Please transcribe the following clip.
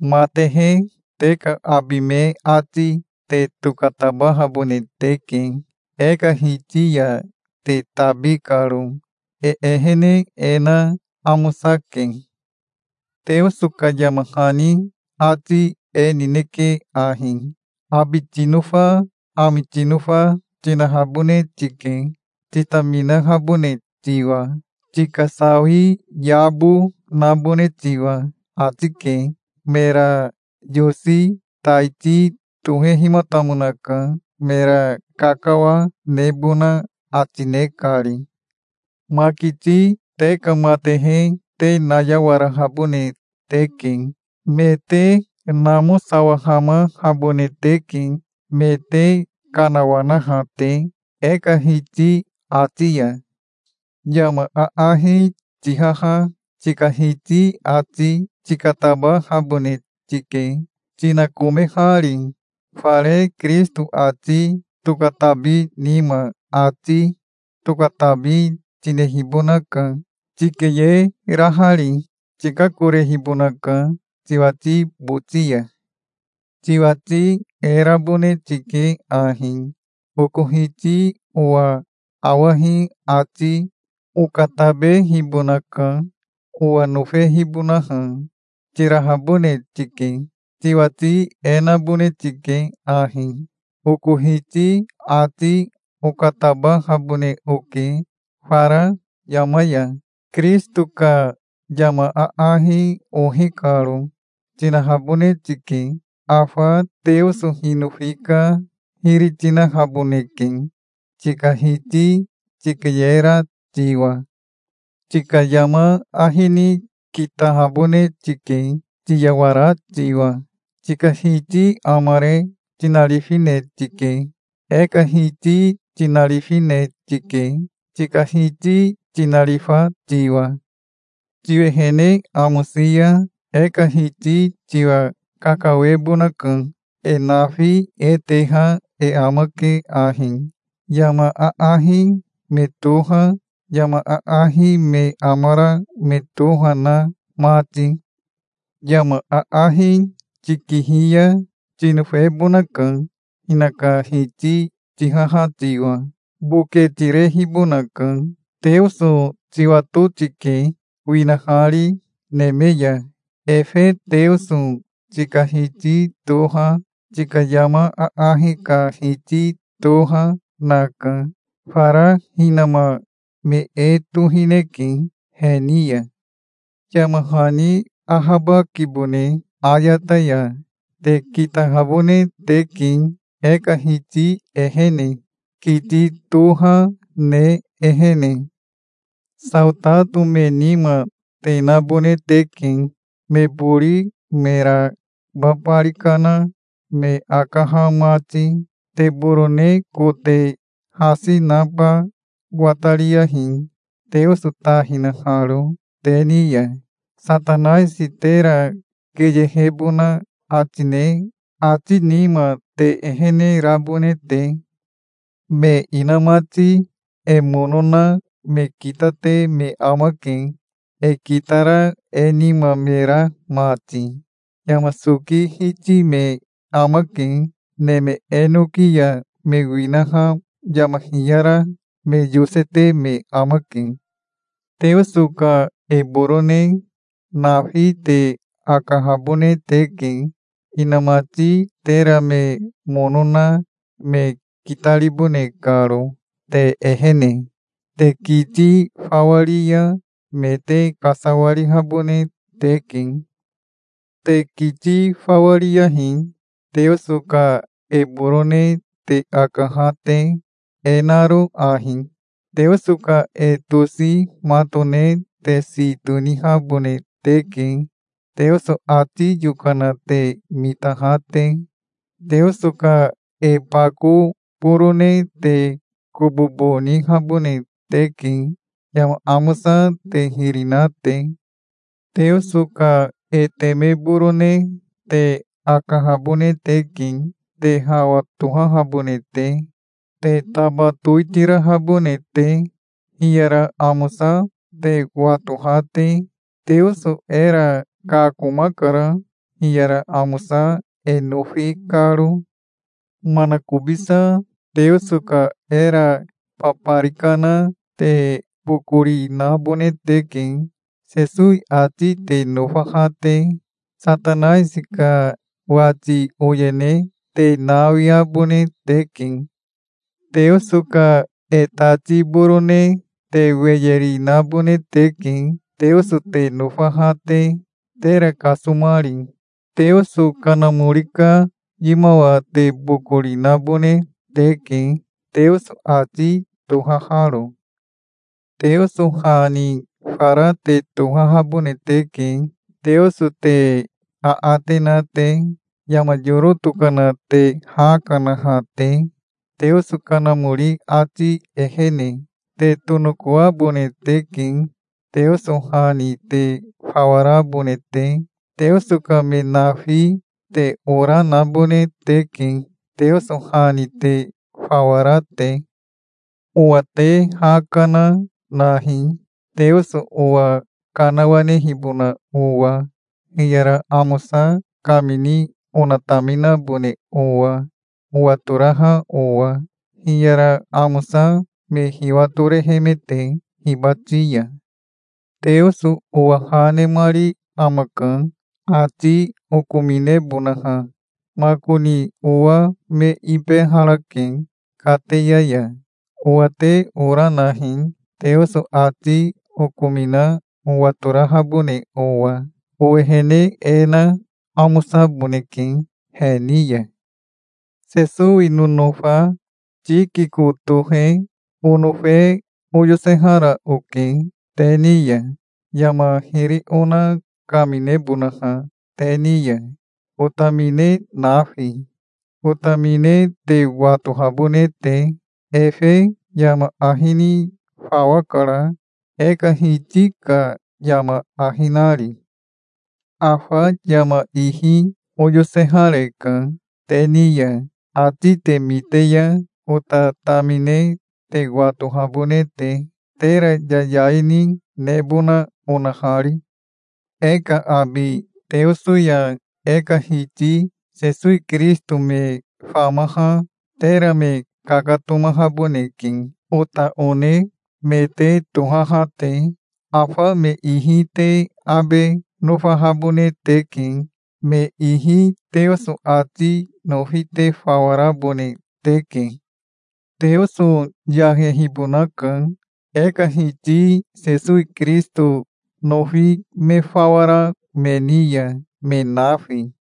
Matehe te ka abi me ati te tokatabahabone teke, e ka Hiti ya te tabi karo. E ehene e na amosake. Teoso ka yama hani ati e nineke ahi: "Abi tinofa, ami tinofa, tinahabone tike, titaminahabone tiwa, tika sawi yabo nabone tiwa", ati ke. Mera yosi taiti tohehimatamonaka, mera kakawa nebona ati, ne kari. Makiti te ka matehe te nayawarahabone teke. Me te namosawahamahabone teke, me te kanawanaha te, e ka Hiti ati ya. Yama aahi tihaha tika hiti ati tikatabahabone tike, tinakomehari. Fare Kirisito ati tokatabi nima ati tokatabi tinehibonaka, tikeyerahari. Tikakorehibonaka tiwati boti ya. Tiwati e rabone tike ahi: "Oko hiti owa awahi ati okatabehibonaka, owa nofehibonaha", tirahabone tike. Tiwati e nabone tike ahi: "Oko hiti ati okatabahabone oke fara yama ya, Kirisito ka yama aahi ohi karo", tinahabone tike. Afa Teoso hinofi ka hiri tinahaboneke tika hiti tikeyera tiwa. Tika yama ahi ni kitahabone tike, tiyawara tiwa. Tika hiti amare tinarifine tike. E ka Hiti tinarifine tike, tika hiti tinarifa tiwa. Tiwehene amosi ya e ka Hiti tiwa kakawebonaka. E nafi e teha e amake ahi, yama aahi me toha, yama aahi me amara me toha na mati. Yama aahi tikihi ya tinofebonaka, hinaka hiti tihaha tiwa. Boke tirehibonaka. Teoso tiwato tike, winahari neme ya. Efe Teoso tika Hiti toha, tika yama aahi ka Hiti toha, naka. Fara hinama me e tohineke he ni ya. Yama hani ahabakibone ayata ya. Te kitahabone teke e ka Hiti ehene, kiti toha ne ehene. Saotato me nima te nabone teke, me bori mera babari kana me akaha mati. Te borone kote hasi naba watariyahi, Teoso ta hinaharo te ni ya, Satanaisi tera keyehebona ati ne ati nima te ehene rabone te. Me inamati e mono na me kitate me amake, e kitara e nima me ra mati. Yama soki hiti me amake. Neme enoki ya me winaha yama hiyara me yosete me amake. Teoso ka e borone nafi te akahabone teke, inamati tera me mono na me kitaribone karo, te ehene. Te kiti fawa ri ya me te kasawarihabone teke. Te kiti fawa riyahi, Teoso ka e borone te akaha te, e naro ahi: Teoso ka e tosi matone te si tonihabone teke, Teoso ati yokana te mitaha te. Teoso ka e bako borone te kobobo nihabone teke, yama amosa te hiri na te. Teoso ka e teme borone te akahabone teke, te hawa tohahabone te, te taba towitirahabone te, hiyara amosa te watoha te. Teoso era kakomakara, hiyara amosa e nofi karo. Manakobisa Teoso ka era babari kana te bokori nabone teke, Sesowi ati te nofaha te. Satanaisi ka wati oyene te nawiabone teke. Teoso ka e tati borone te weye ri nabone teke, Teoso te nofaha te, tera kasomari. Teoso Kanamori ka yimawa te bokori nabone teke, Teoso ati tohaharo. Teoso ha ni fara te tohahabone teke, Teoso te aate na te, yama yoro tokana te ha kanaha te, Teoso Kanamori ati ehene. Te tonokoabone teke, Teoso ha ni te fawa rabone te. Teoso ka me nafi te ora nabone teke, Teoso ha ni te fawa ra te. Owa te ha kana nahi, Teoso owa kanawanehibona owa, hiyara amosa kamini onataminabone owa, owatoraha owa, hiyara amosa me hiwatorehemete hibati ya. Teoso owa ha nemari amaka, ati okominebonaha. Makoni owa me ibeharake kateya ya. Owa te ora nahi, Teoso ati okomina owatorahabone owa. Owehene e na amosaboneke he ni ya. Sesowi nonofa Tikiko tohe onofe oyosehara oke te ni ya, yama hiri ona kaminebonaha te ni ya, otamine nafi, otamine te watohabone te. Efe yama ahi ni fawa kara, e ka Hiti ka yama ahi nari. Afa yama ihi oyosehareka te ni ya, ati te mite ya ota tamine te watohabone te, tera yayai ni nebona onahari. E ka abi Teoso ya e ka Hiti Sesowi Kirisito me famaha tera me kakatomahaboneke, ota one me te tohaha te. Afa me ihi te abe nofahabone teke. Me ihi Teoso ati nofi te fawa rabone teke. Teoso yahehibonaka e ka Hiti Sesowi Kirisito nofi me fawa ra me ni ya, me nafi.